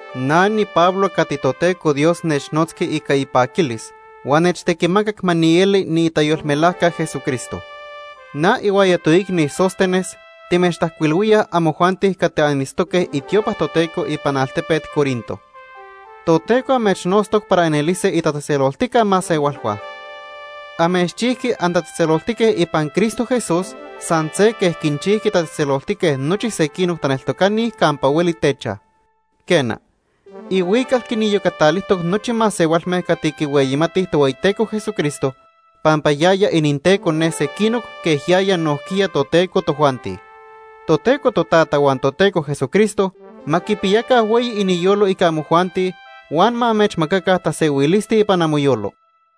Na niPablo cati Toteco Dios nechnotzqui ica ipaquilis huan nechtequimacac ma nieli niitayolmelajca Jesucristo. Na ihuaya toicni Sóstenes timechtajcuilhuíaj amojuanti cati anitztoque itiopa Toteco ipan altepet Corinto. Toteco amechnotztoc para anelise itatzejtzeloltica masehualhua. Amechchijqui antatzejtzeloltique ipan Cristo Jesús san se quej quinchijqui tatzejtzeloltique nochi sequinoc taneltocani campa hueli techaj. Quena, ihuical quiniyocatalijtoc nochi masehualme cati quihueyimatij Tohueyiteco Jesucristo, pampa yaya ininTeco ne sequinoc quej yaya nojquiya toTeco tojuanti. Toteco Totata huan Toteco Jesucristo ma quipiyaca hueyi iniyolo ica amojuanti huan ma amechmacaca tasehuilisti ipan amoyolo.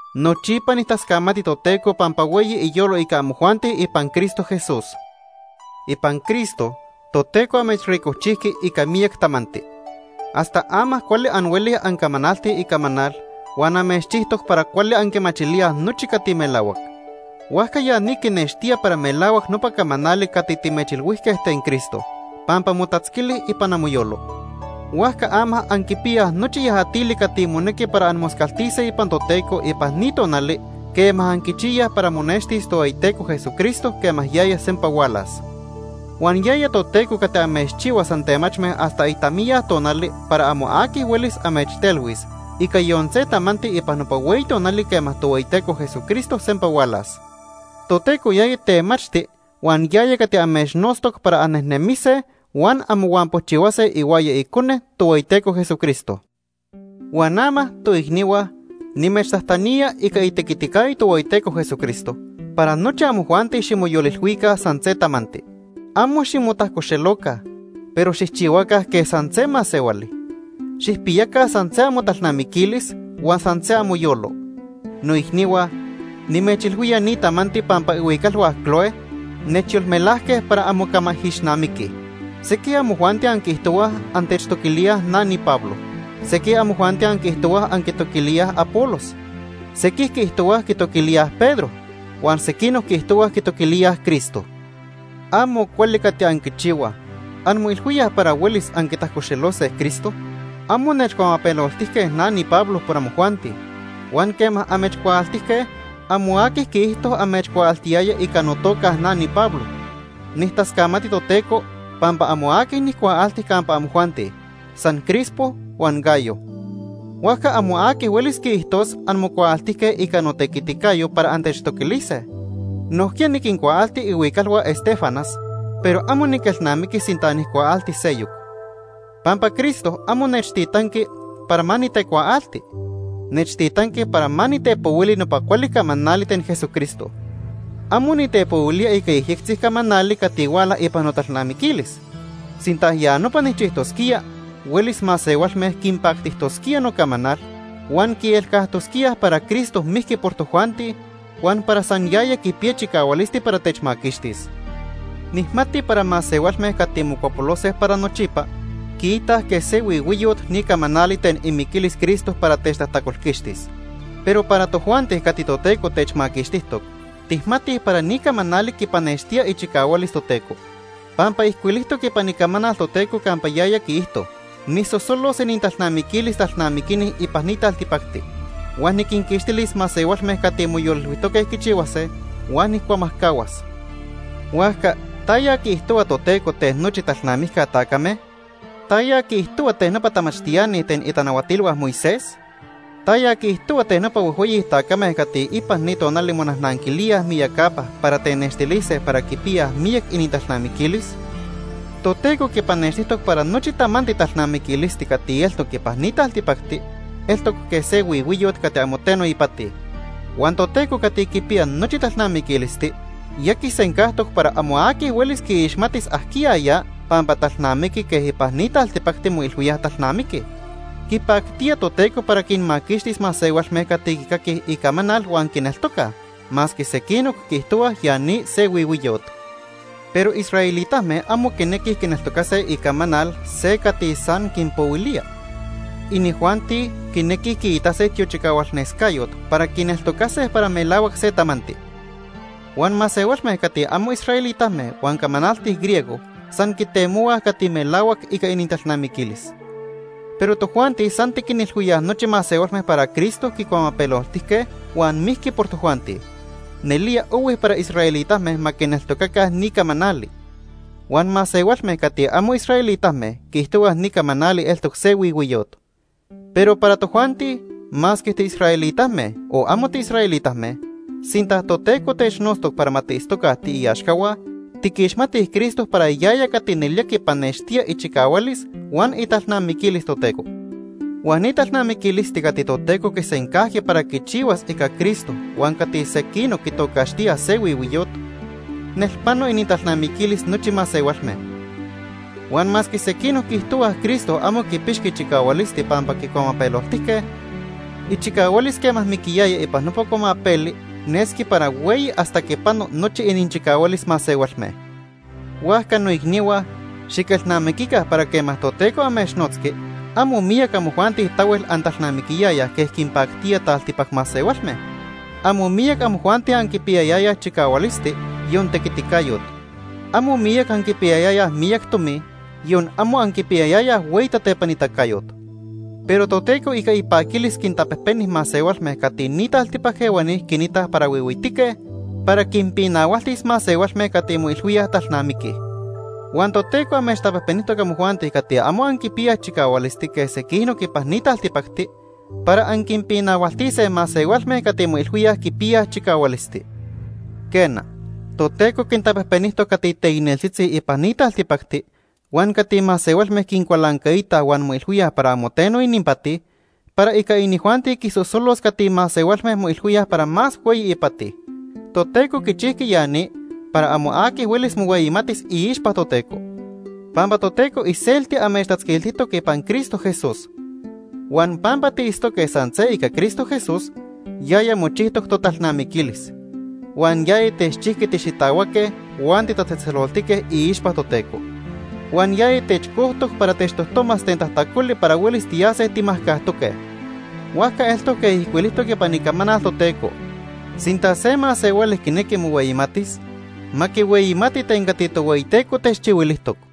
Nochipa nijtascamati Toteco pampa hueyi iyolo ica amojuanti ipan Cristo Jesús. Ipan Cristo, Toteco amechricojchijqui ica miyac tamanti hasta ama cuali anhuelij ancamanaltij icamanal huan amechchijtoc para cuali anquimachilíaj nochi cati melahuac. Huajca ya ni quinextía para melahuac nopa camanali cati timechilhuijque ten Cristo, pampa motatzquili ipan amoyolo. Huajca ama anquipiyaj nochi yajatili cati monequi para anmoscaltise ipan Toteco ipan ni tonali quema anquichiyaj para monextis Tohueyiteco Jesucristo quema yaya sempa hualas. Huan yaya Toteco cati amechchihuas antemachme hasta itamiya tonali para amo aqui huelis amechtelhuis ica yon se tamanti ipan nopa hueyi tonali quema Tohueyiteco Jesucristo sempa hualas. Toteco yaya temachti huan yaya cati amechnotztoc para annejnemise huan anmohuampochihuase ihuaya Icone, Tohueyiteco Jesucristo. Huan ama, toicnihua, nimechtajtanía ica itequiticayo Tohueyiteco Jesucristo para nochi amojuanti ximoyolilhuica san se tamanti. Amo ximotajcoxeloca, pero xijchihuaca quej san se masehuali. Xijpiyaca san se amotalnamiquilis huan san se amoyolo. Noicnihua, nimechilhuía ni tamanti pampa ihuicalhua Cloé nechyolmelajque para anmocamaijixnamiquij. Sequij amojuanti anquiijtohuaj antechtoquilíaj na niPablo. Sequij amojuanti anquiijtohuaj anquitoquilíaj Apolos. Sequij quiijtohuaj quitoquilíaj Pedro. Huan sequinoc quiijtohuaj quitoquilíaj Cristo. Amo cuali cati anquichihuaj. ¿Anmoilhuíaj para huelis anquitajcoxelose Cristo? Amo nechcuamapeloltijque na niPablo por amojuanti. Huan quema amechcuaaltijque, amo aqui quiijto amechcuaaltiyaya ica notoca Ica notequiticayo. na niPablo. Nijtascamati Toteco pampa amo aqui nijcuaalti campa amojuanti, san Crispo huan Gayo. Huajca amo aqui huelis quiijtos anmocuaaltijque ica notequiticayo para antechtoquilise. Nojquiya niquincuaalti ihuicalhua Estéfanas, pero amo niquelnamiqui sinta nijcuaalti seyoc. Pampa Cristo amo nechtitanqui para ma nitecuaalti. Nechtitanqui para ma nitepohuili nopa cuali camanali ten Jesucristo. Amo nitepohuilía ica yejyectzi camanali cati huala ipan notalnamiquilis. Sinta ya nopa nijchijtosquía, huelis masehualme quinpactijtosquía nocamanal huan quielcajtosquíaj para Cristo mijqui por tojuanti huan para san yaya quipiya chicahualisti para techmaquixtis. Nijmati para masehualme cati mocuapolose para nochipa quiitaj quej se huihuiyot ni camanali ten imiquilis Cristo para techtajtacolquixtis. Pero para tojuanti cati Toteco techmaquixtijtoc, tijmatij para ni camanali quipanextía ichicahualis Toteco. Pampa ijcuilijtoc ipan Icamanal Toteco campa yaya quiijto: “Nijsosolos inintalnamiquilis talnamiquini ipan ni taltipacti. Huan niquinquixtilis masehualme cati moyolilhuijtoque quichihuase, huan nijcuamajcahuas.” Huajca ¿taya quiijtohua Toteco ten nochi talnamijca tacame? ¿Taya quiijtohua ten nopa tamachtiani ten itanahuatilhua Moisés? ¿Taya quiijtohua ten nopa huejhueyi tacame cati ipan ni tonali monajnanquilíaj miyacapa para tenextilise para quipiyaj miyac inintalnamiquilis? Toteco quipanextijtoc para nochi tamanti talnamiquilisti cati eltoc ipan ni taltipacti eltoc quej se huihuiyot cati amo teno ipati. Huan Toteco cati quipiya nochi talnamiquilisti ya quisencajtoc para amo aqui huelis quiixmatis ajquiya ya pampa talnamiqui quej ipan ni taltipacti moilhuíaj talnamiquij. Quipactía Toteco para quinmaquixtis masehualme cati quicaquij icamanal huan quineltocaj, masque sequinoc quiijtohuaj ya ni se huihuiyot. Pero israelitame amo quinequij quineltocase icamanal se cati san quinpohuilíaj. Inijuanti quinequij quiitase tiochicahualnescayot para quineltocase para melahuac se tamanti. Huan masehualme cati amo israelitame huan camanaltij griego san quitemohuaj cati melahuac ica inintalnamiquilis. Pero tojuanti san tiquinilhuíaj nochi masehualme para Cristo quicuamapeloltijque huan mijqui por tojuanti. Nelía ohui para israelitame ma quineltocaca ni camanali. Huan masehualme cati amo israelitame quiijtohuaj ni camanali eltoc se huihuiyot. Pero para tojuanti, masque tiisraelitame, o amo tiisraelitame, sinta Toteco technotztoc para ma tiitztoca tiiaxcahua, tiquixmatij Cristo para yaya cati nelía quipanextía ichicahualis huan italnamiquilis Toteco. Huan ni talnamiquilisti cati Toteco quisencajqui para quichihuas ica Cristo huan cati sequinoc quitocaxtíaj se huihuiyot, nelpano inintalnamiquilis nochi masehualme. Huan masque sequinoc quiijtohuaj Cristo amo quipixqui chicahualisti pampa quicuamapeloltijque, ichicahualis quema miquiyaya ipan nopa cuamapeli nesqui para hueyi hasta quipano nochi ininchicahualis masehualme. Huajca noicnihua, xiquelnamiquica para quema Toteco amechnotzqui, amo miyac amojuanti tahuel antalnamiquiyayaj quej quinpactía taltipac masehualme. Amo miyac amojuanti anquipiyayayaj chicahualisti, yon tequiticayot. Amo miyac anquipiyayayaj miyac tomi, yon amo anquipiyayayaj hueyi tatepanitacayot. Pero Toteco ica ipaquilis quintapejpeni masehualme cati ni taltipac ehuani quinitaj para huihuitique para quinpinahualtis masehualme cati moilhuíaj talnamiquij. Huan Toteco amechtapejpenijtoc amojuanti cati amo anquipiyaj chicahualisti quej sequinoc ipan ni taltipacti, para anquinpinahualtise masehualme cati moilhuíaj quipiyaj chicahualisti. Quena, Toteco quintapejpenijtoc cati teicneltzitzi ipan ni taltipacti huan cati masehualme quincualancaitaj huan moilhuíaj para amo teno ininpati para ica inijuanti quisosolos cati masehualme moilhuíaj para más hueyi ipati. Toteco quichijqui ya ni para amo aqui huelis mohueyimatis iixpa Toteco. Pampa Toteco iselti amechtatzquiltijtoc ipan Cristo Jesús. Huan pampa tiitztoque san se ica Cristo Jesús, yaya mochijtoc totalnamiquilis. Huan yaya techchijqui tixitahuaque huan titatzejtzeloltique iixpa Toteco. Huan yaya techcojtoc para techtojtomas ten tajtacoli para huelis tiyase timajcajtoque. Huajca eltoc quej ijcuilijtoc ipan Icamanal Toteco: “Sinta se masehuali quinequi mohueyimatis, ma quihueyimati ten cati Tohueyiteco techchihuilijtoc.”